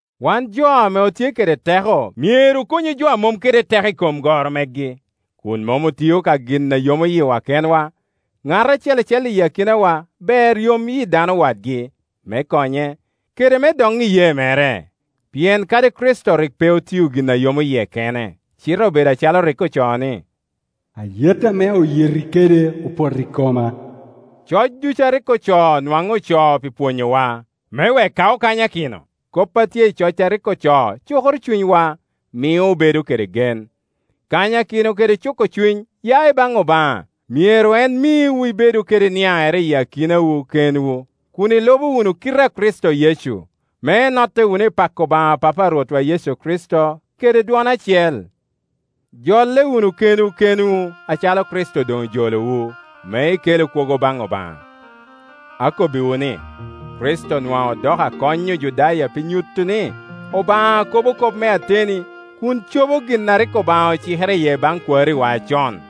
Wan jo ame otye kede teko myero okonyu jo a mom kede teko i kom goro megi, kun mom otio ka gin a yomo yiwa kenwa. Ŋat acel acel i akinawa ber yom yi dano wadgi, me konye, kede me doŋ iyee mere; pien kadi Kricito rik pe otio gin a yomo yie kene, cite obedo acalo rik ocoo, ni, “Ayet ame oyeti kede opoto i koma.” Coc ducu a rik ocoo nwaŋ ocoo pi pwonyowa, me wek ka okanyakino, kop a tye i coc a rik ocoo cukoro cunywa, mio obedo kede gen. Kanyakino kede cuko cuny ya i baŋ Obaŋa; myero en miwu ibedu kede niaŋere i kinwu kenwu kun ilubo wunu kite a Kricito Yecu, me inotte wunu i pako Obaŋa Papa a Rwotwa Yecu Kricito kede dwon acel. Jolle wunu kenwu kenwu, acalo Kricito doŋ ojolowu, me ikelu kwogo baŋ Obaŋa. Akobbiwu ni, Kricito nwaŋ odoko akony Ojudaya pi nyuto ni Obaŋa kobo kop me ateni, kun cobo gin a rik Obaŋa ocikere iye baŋ kwariwa acon,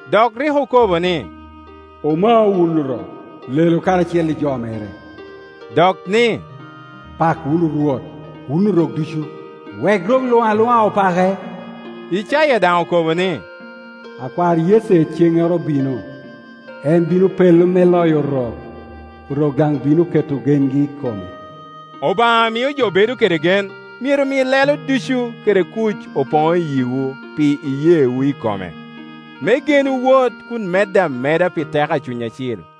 Dok rik okobo ni, “Omau wun Orok, lelu karacel i jo mere”, dok ni, “Pak wunu Rwot, wun Orok ducu, wek rok luŋ aluŋa opake.” Icaya daŋ okobo ni, “Akwar Yece ceŋŋoro bino; en bino pello me loyo Orok, Orok daŋ bino keto gengi i kome.” Obaŋa a mio jo bedo kede gen myero mi lelo ducu kede kuc poŋ i yiwu pi iyeewu i kome, me genwu wot kun medde ameda pi teko a Cuny Acil.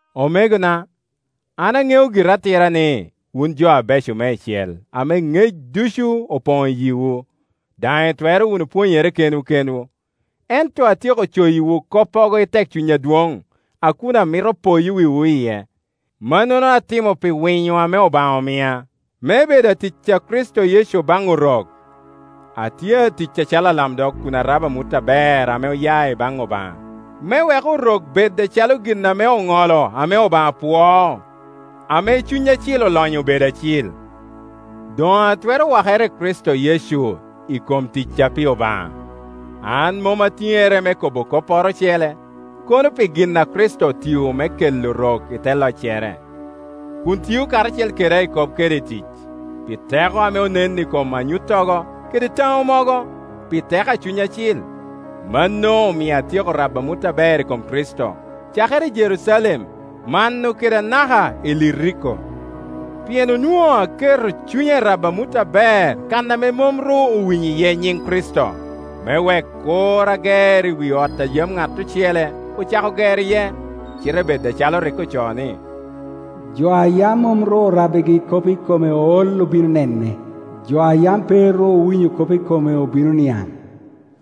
Omegona, an aŋeo gira atira ni, wun jo abeco meicel, ame ŋec ducu opoŋ i yiwu, daŋ itwero wunu pwonyere kenwu kenwu. Ento atyeko coyiwu koppogo i tekcuny adwoŋ, a kun amito poyo wiwu iye. Mannono atimo pi winyo ame Obaŋa omia, me bedo atic a Kricito Yecu baŋ Orok. Atye atic acalo alamdog kun arabo amut aber ame oya i baŋ Obaŋa, me wek Orok bed acalo gin ame oŋolo ame Obaŋa pwoo, ame Cuny Acil olonyo obedo acil. Doŋ atwero wakere i Kricito Yecu i kom ticca pi Obaŋa. An mom atiŋere me kobo kopporo ocele, kono pi gin ame Kricito otio me kela Orok i te loccere, kun tio karacel keda i kop kede i tic, pi teko ame onen i kom anyuttogo kede taŋo mogo, pi teko a Cuny Acil. Mano omio atyeko rabo amut aber i kom Kricito, cakere i Jerucalem, mano kede anaka i Iliriko; pien onwoŋo aketo cunya i rabo amut aber kan ame mom ru owinyo iye nyiŋ Kricito, me wek kur ager i wi ot a yam ŋat ocele ocako gero iye, cite bed acalo rik ocoo ni, “Jo ayam mom ru orabbigi kop i kome ol obino nene, jo a yam pe ru owinyo kop i kome obino niaŋ.”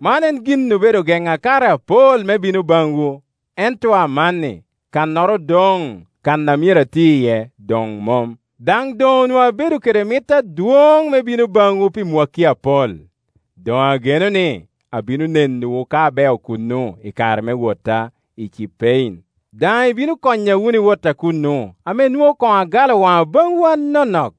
Man en gin obedo gena kare apol me bino baŋwu. Ento amanni kannoro odoŋ kan a myero ati iye doŋ mom, daŋ doŋ onwoŋo abedo kede mit adwoŋ me bino baŋwu pi mwakki apol. Doŋ ageno ni abino nenowu ka abeo kuno i kare me wota i Cipein, daŋ ibino konya wunu i wotta kuno ame nwoŋo koŋ agalo waŋa baŋwu anonok.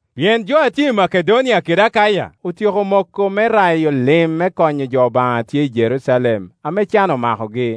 Pien jo a tye i Makedonia kede Akaya otyeko moko me rayo lim me konyo jo Obaŋa a tye i Jerucalem ame can omakogi.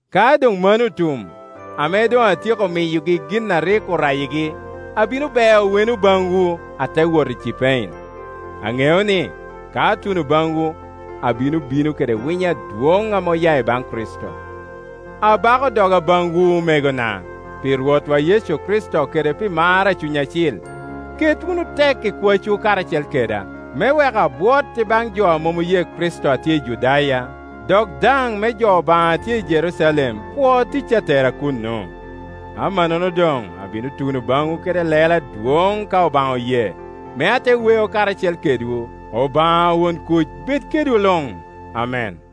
Ka doŋ mano otum, ame doŋ atyeko miyogi gin a rik orayigi, abino beo weno baŋwu, ate wot i Cipein. Aŋeo ni, ka atuno baŋwu, abino bino kede winyo adwoŋ ame oya i baŋ Kricito. Abako doga baŋwu, omegona, pi Rwotwa Yecu Kricito kede pi mar a Cuny Acil, ket wunu tek i kwacwu karacel keda, me wek abwot i baŋ jo a mom oye Kricito a tye i Judaya, dok daŋ me jo Obaŋa a tye i Jerucalem pwo tic a tera kuno. Amannono doŋ abino tuno baŋwu kede lelo adwoŋ ka Obaŋa oye, me ate weo karacel kedwu. Obaŋa won kuc bed kedwu luŋ. Amen.